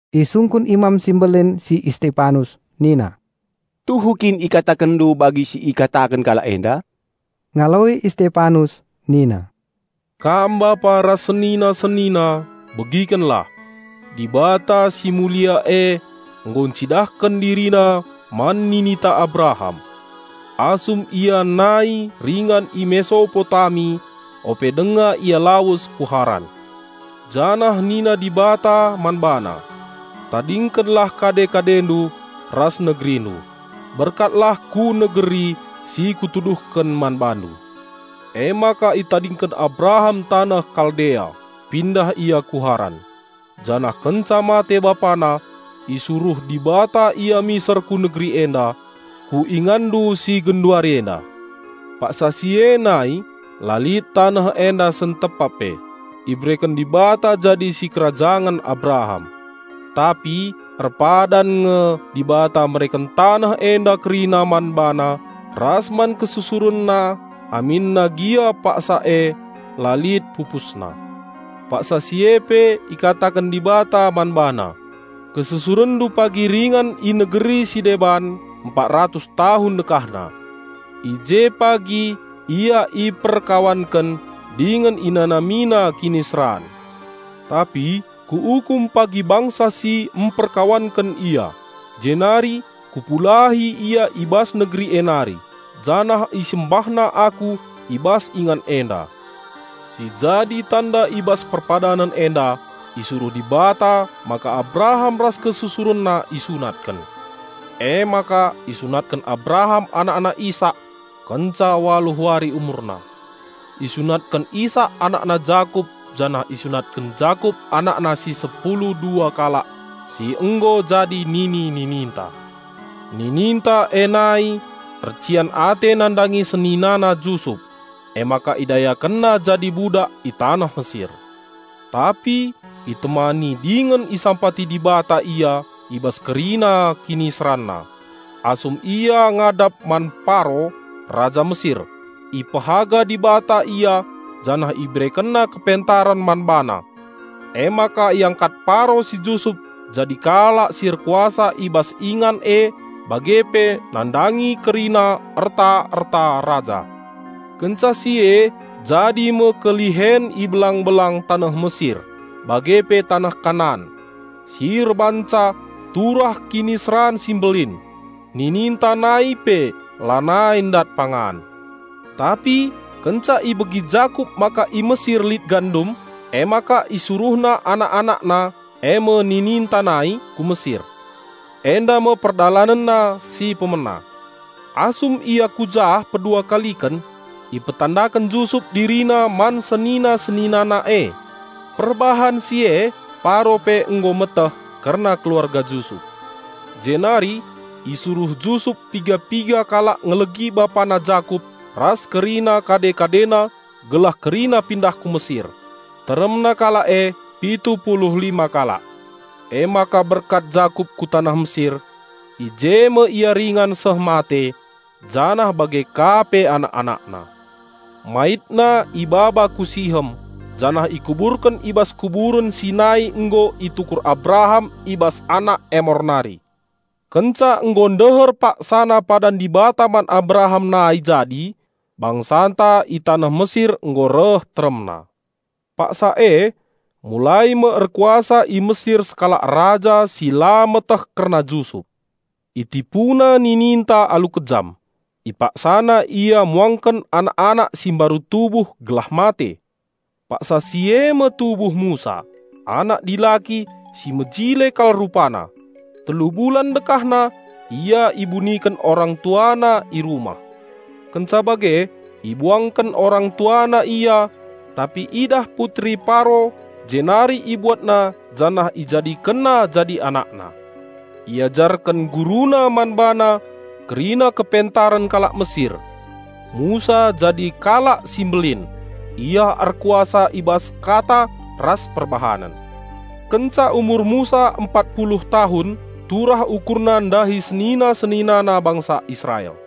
Isungkun Imam si Mbelin si Istepanus nina, "Tuhu kin ikatakenndu bagi si ikataken kalak enda?" Ngaloi Istepanus nina, "Kam bapa ras senina-senina, begikenlah! Dibata si Mulia e nggo ncidahken DiriNa man nininta Abraham, asum ia nai ringan i Mesopotami, ope denga ia lawes ku Haran. Janah nina Dibata man bana, 'Tadingkenlah kade-kadendu ras negerindu; berkatlah ku negeri si Kutuduhken man bandu.' Emaka itadingken Abraham taneh Kaldea, pindah ia ku Haran. Janah kenca mate bapana, isuruh Dibata ia miser ku negeri enda, ku inganndu si genduari enda. Paksa si e nai la lit taneh enda sentepap pe ibereken Dibata jadi si kerajangen Abraham. Tapi erpadan nge Dibata mereken taneh enda kerina man bana ras man kesusurenna aminna gia paksa e la lit pupusna. Paksa si e pe ikataken Dibata man bana, 'Kesusurenndu pagi ringan i negeri si deban empat ratus tahun dekahna. I je pagi ia iperkawanken dingen inanamina kiniseran. Tapi Kuukum pagi bangsa si emperkawanken ia, jenari Kupulahi ia i bas negeri e nari janah isembahna Aku i bas ingan enda.' Si jadi tanda i bas perpadanen enda isuruh Dibata maka Abraham ras kesusurenna isunatken. Emaka isunatken Abraham anakna Isak kenca waluh wari umurna. Isunatken Isak anakna Jakup janah isunatken Jakup anakna si sepulu dua kalak si nggo jadi nini-nininta. Nininta e nai ercian ate nandangi senina Jusup, emaka idayakenna jadi budak i taneh Mesir. Tapi itemani dingen isampati Dibata ia i bas kerina kiniseranna. Asum ia ngadap man Paro, raja Mesir, ipehaga Dibata ia janah IberekenNa kepentaren man bana. Emaka iangkat Paro si Jusup jadi kalak si erkuasa i bas ingan e bage pe nandangi kerina erta-erta raja. Kenca si e jadi me kelihen i belang-belang taneh Mesir bage pe taneh Kanan, si erbahanca turah kiniseran si mbelin. Nininta nai pe lanai ndat pangan. Tapi kenca ibegi Jakup maka i Mesir lit gandum, emaka isuruhna anak-anakna, eme nininta nai, ku Mesir. Enda me perdalanenna si pemena. Asum ia ku jah pedua kaliken, ipetandaken Jusup dirina man senina-seninana e. Perbahan si e, Paro pe nggo meteh kerna keluarga Jusup. Jenari isuruh Jusup piga-piga kalak ngelegi bapana Jakup ras kerina kade-kadena gelah kerina pindah ku Mesir. Teremna kalak e pitu pulu lima kalak. Emaka berkat Jakup ku taneh Mesir. I je me ia ringan seh mate janah bage ka pe anak-anakna. Maitna ibaba ku Sihem janah ikuburken i bas kuburen si nai nggo itukur Abraham i bas anak Emor nari. Kenca nggo ndeher paksana padan Dibata man Abraham nai jadi, bangsanta i taneh Mesir nggo reh teremna. Paksa e mulai me erkuasa i Mesir sekalak raja si la meteh kerna Jusup. Itipuna nininta alu kejam. Ipaksana ia muangken anak-anak si mbaru tubuh gelah mate. Paksa si eme tubuh Musa, anak dilaki si mejile kal rupana. Telu bulan dekahna ia ibuniken orangtuana i rumah. Kenca bage ibuangken orang tuana ia. Tapi idah putri Paro jenari ibuatna janah ijadikenna jadi anakna. Iajarken guruna man bana kerina kepentaren kalak Mesir. Musa jadi kalak si mbelin. Ia erkuasa i bas kata ras perbahanen. Kenca umur Musa empat puluh tahun umur Musa turah ukurna ndahi senina-seninana bangsa Israel.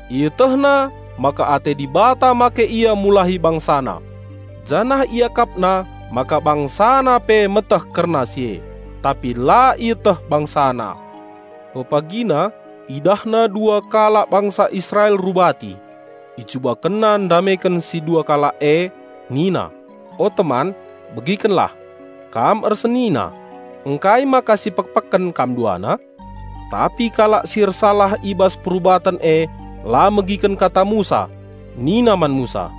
Ietehna ate Dibata make ia mulahi bangsana. Janah iakapna maka bangsana pe meteh kerna si e; tapi la ieteh bangsana. Pepagina idahna dua kalak bangsa Israel rubati. Icubakenna ndameken si dua kalak e nina, 'O teman begikenlah! Kam ersenina; ngkai maka sipekpeken kam duana?' Tapi kalak si ersalah i bas perubaten e la megiken kata Musa nina man Musa,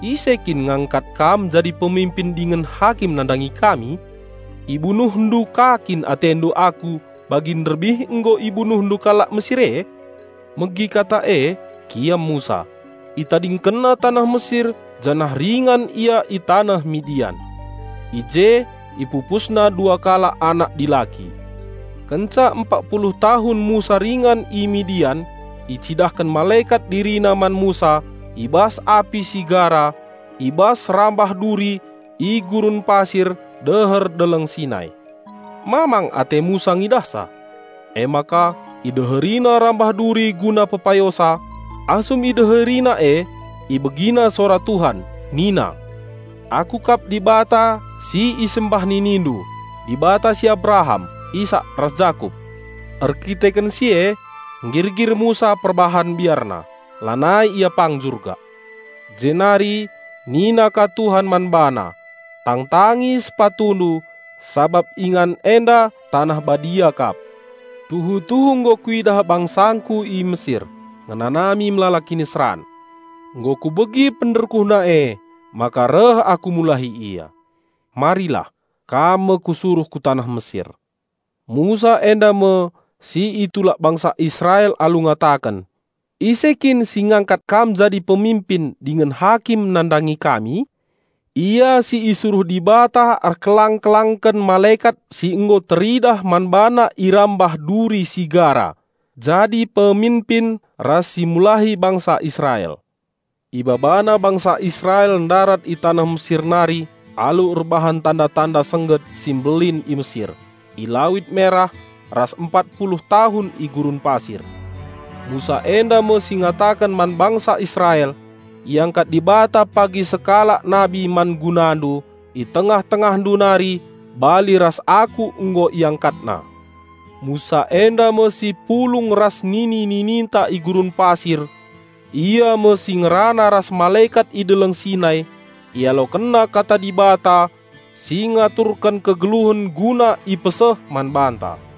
'Ise kin ngangkat kam jadi peminpin dingen hakim nandangi kami? Ibunuhndu ka kin atendu aku bagi nderbih nggo ibunuhndu kalak Mesir e.' Megi kata e, kiam Musa, itadingkenna taneh Mesir janah ringan ia i taneh Midian. I je ipupusna dua kalak anak dilaki. Kenca empat puluh tahun Musa ringan i Midian icidahken malekat dirina man Musa i bas api si gara i bas rambah duri i gurun pasir deher Deleng Sinai. Mamang ate Musa ngidahsa. Emaka ideherina rambah duri guna pepayosa. Asum ideherina e ibegina sora Tuhan nina, 'Aku kap Dibata si isembah ninindu, Dibata si Abraham, Isak ras Jakup.' Erdandanken si e nggirgir Musa perbahan biarna. Lanai ia pang jurgak. Jenari nina ka Tuhan man bana, 'Tangtangi sepatundu sabap ingan enda taneh Badia kap. Tuhu-tuhu nggo Kuidah bangsangKu i Mesir ngenanami melala kiniseran. Nggo Kubegi pernderkuhna emaka reh Aku mulahi ia. Marilah, kam me kusuruh ku taneh Mesir.' Musa enda me si itulak bangsa Israel alu ngataken, 'Ise kin si ngangkat kam jadi peminpin dingen hakim nandangi kami?' Ia si isuruh Dibata erkelang-kelangken malekat si nggo teridah man bana i rambah duri si gara jadi peminpin ras simulahi bangsa Israel. Ibabana bangsa Israel ndarat i taneh Mesir nari alu erbahan tanda-tanda sengget si mbelin i Mesir, i Lawit Merah, ras empat puluh tahun i gurun pasir. Musa enda me si ngataken man bangsa Israel, 'Iangkat Dibata pagi sekalak nabi man gunandu, i tengah-tengahndu nari, bali ras aku nggo IangkatNa.' Musa enda me si pulung ras nini-nininta i gurun pasir. Ia me si ngerana ras malekat i Deleng Sinai. Ialokenna kata Dibata si ngaturken kegeluhen guna ipeseh man banta.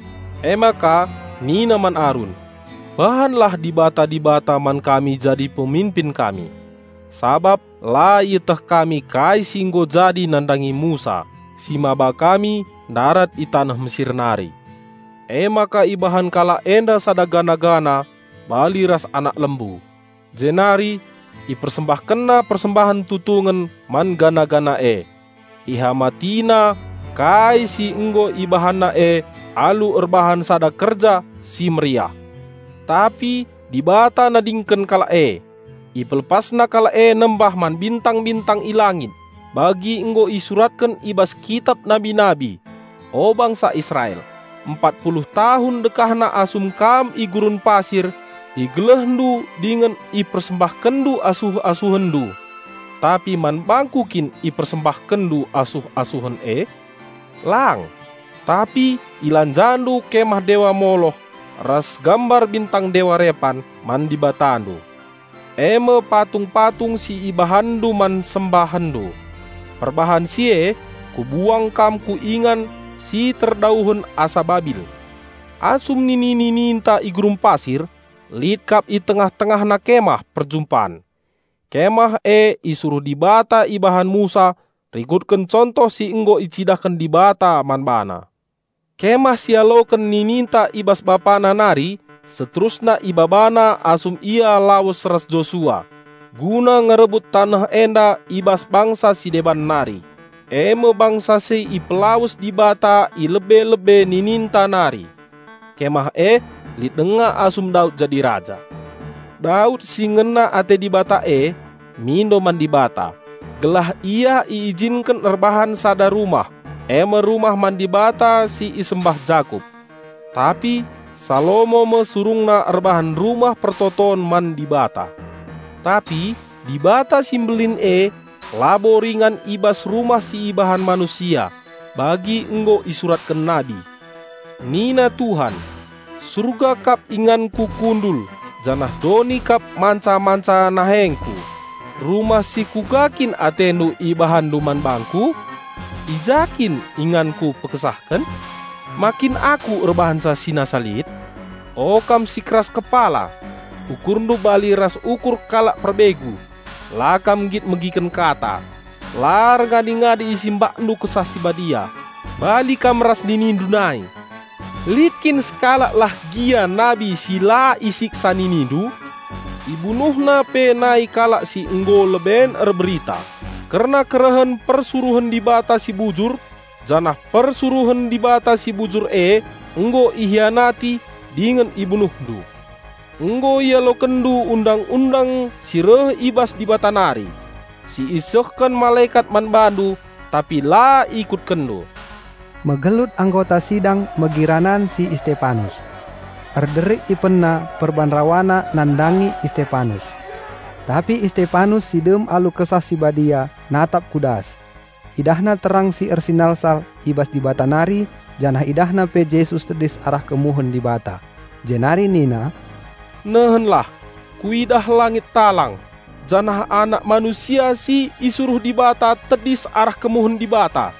Emaka nina man Arun, 'Bahanlah dibata-dibata man kami jadi peminpin kami. Sabap la ieteh kami kai si nggo jadi nandangi Musa si maba kami ndarat i taneh Mesir nari.' Emaka ibahan kalak enda sada patung, bali ras anak lembu. Jenari ipersembahkenna persembahen tutungen man patung e. Ihamatina kai si nggo ibahanna e alu erbahan sada kerja si meriah. Tapi Dibata nadingken kalak e. Ipelepasna kalak e nembah man bintang-bintang i langit, bagi nggo isuratken i bas kitap nabi-nabi, 'O bangsa Israel! Empat puluh tahun dekahna asum kam i gurun pasir, igelehndu dingen ipersembahkenndu asuh-asuhenndu. Tapi man bangKu kin ipersembahkenndu asuh-asuhen e? Lang! Tapi ilanjandu kemah dewa Moloh ras gambar bintang dewa Repan man dibatandu; eme patung-patung si ibahanndu man sembahenndu. Perbahan si e Kubuang kam ku ingan si terdauhen asa Babil.' Asum nini-nininta i gurun pasir, lit kap i tengah-tengahna Kemah Perjumpan. Kemah e isuruh Dibata ibahan Musa rikutken contoh si nggo icidahken Dibata man bana. Kemah si ialoken nininta i bas bapana nari seterusna ibabana asum ia lawes ras Josua guna ngerebut taneh enda i bas bangsa si deban nari, eme bangsa si ipelawes Dibata i lebe-lebe nininta nari. Kemah e lit denga asum Daud jadi raja. Daud si ngena ate Dibata e, mindo man Dibata, gelah ia iijinken erbahan sada rumah, eme rumah man Dibata si isembah Jakup. Tapi Salomo me surungna erbahan Rumah Pertoton man Dibata. Tapi Dibata si Mbelin e labo ringan i bas rumah si ibahan manusia; bagi nggo isuratken nabi, Nina Tuhan, 'Surga kap inganKu kundul janah doni kap manca-manca nahengKu. Rumah si kuga kin atendu ibahanndu man bangKu? I ja kin inganKu pekesahken? Ma kin Aku erbahanca si nasa lit?' O kam si keras kepala! Ukurndu bali ras ukur kalak perbegu, la kam nggit megiken kata. La erngadi-ngadi IsimbakNdu Kesah Si Badia. Bali kam ras ninindu nai! Lit kin sekalak lah gia nabi si la isiksa ninindu? Ibunuhna pe nai kalak si nggo leben erberita kerna kerehen Persuruhen Dibata si Bujur janah Persuruhen Dibata si Bujur e nggo ihianati dingen ibunuhndu. Nggo ialokenndu Undang-undang si reh i bas Dibata nari, si isehken malekat man bandu tapi la ikutkenndu." Megelut anggota sidang megi ranan si Istepanus. Erderik ipenna perban rawana nandangi Istepanus. Tapi Istepanus si dem alu Kesah Si Badia, natap ku das. Idahna terang si ersinalsal i bas Dibata nari janah idahna pe Jesus tedis arah kemuhen Dibata. Jenari nina, "Nehenlah! Kuidah langit talang, janah Anak Manusia si isuruh Dibata tedis arah kemuhen Dibata."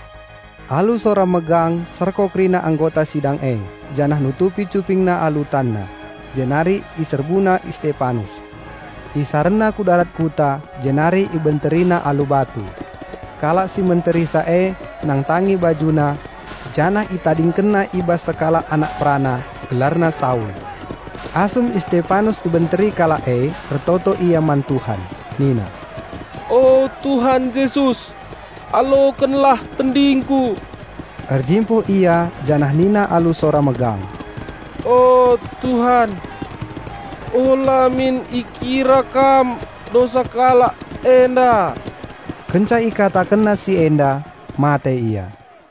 Alu sora megang serko kerina anggota sidang e janah nutupi cupingna alu tanna. Jenari iserbuna Istepanus. Isarenna ku darat kuta, jenari ibenterina alu batu. Kalak si menterisa e nangtangi bajuna, janah itadingkenna i bas sekalak anak perana; gelarna Saul. Asum Istepanus ibenteri kalak e, ertoto ia man Tuhan nina, "O Tuhan Jesus, alokenlah tendingku!" Erjimpuh ia janah nina alu sora megang, "O Tuhan, ula min ikira Kam dosa kalak enda." Kenca ikatakenna si enda, mate ia.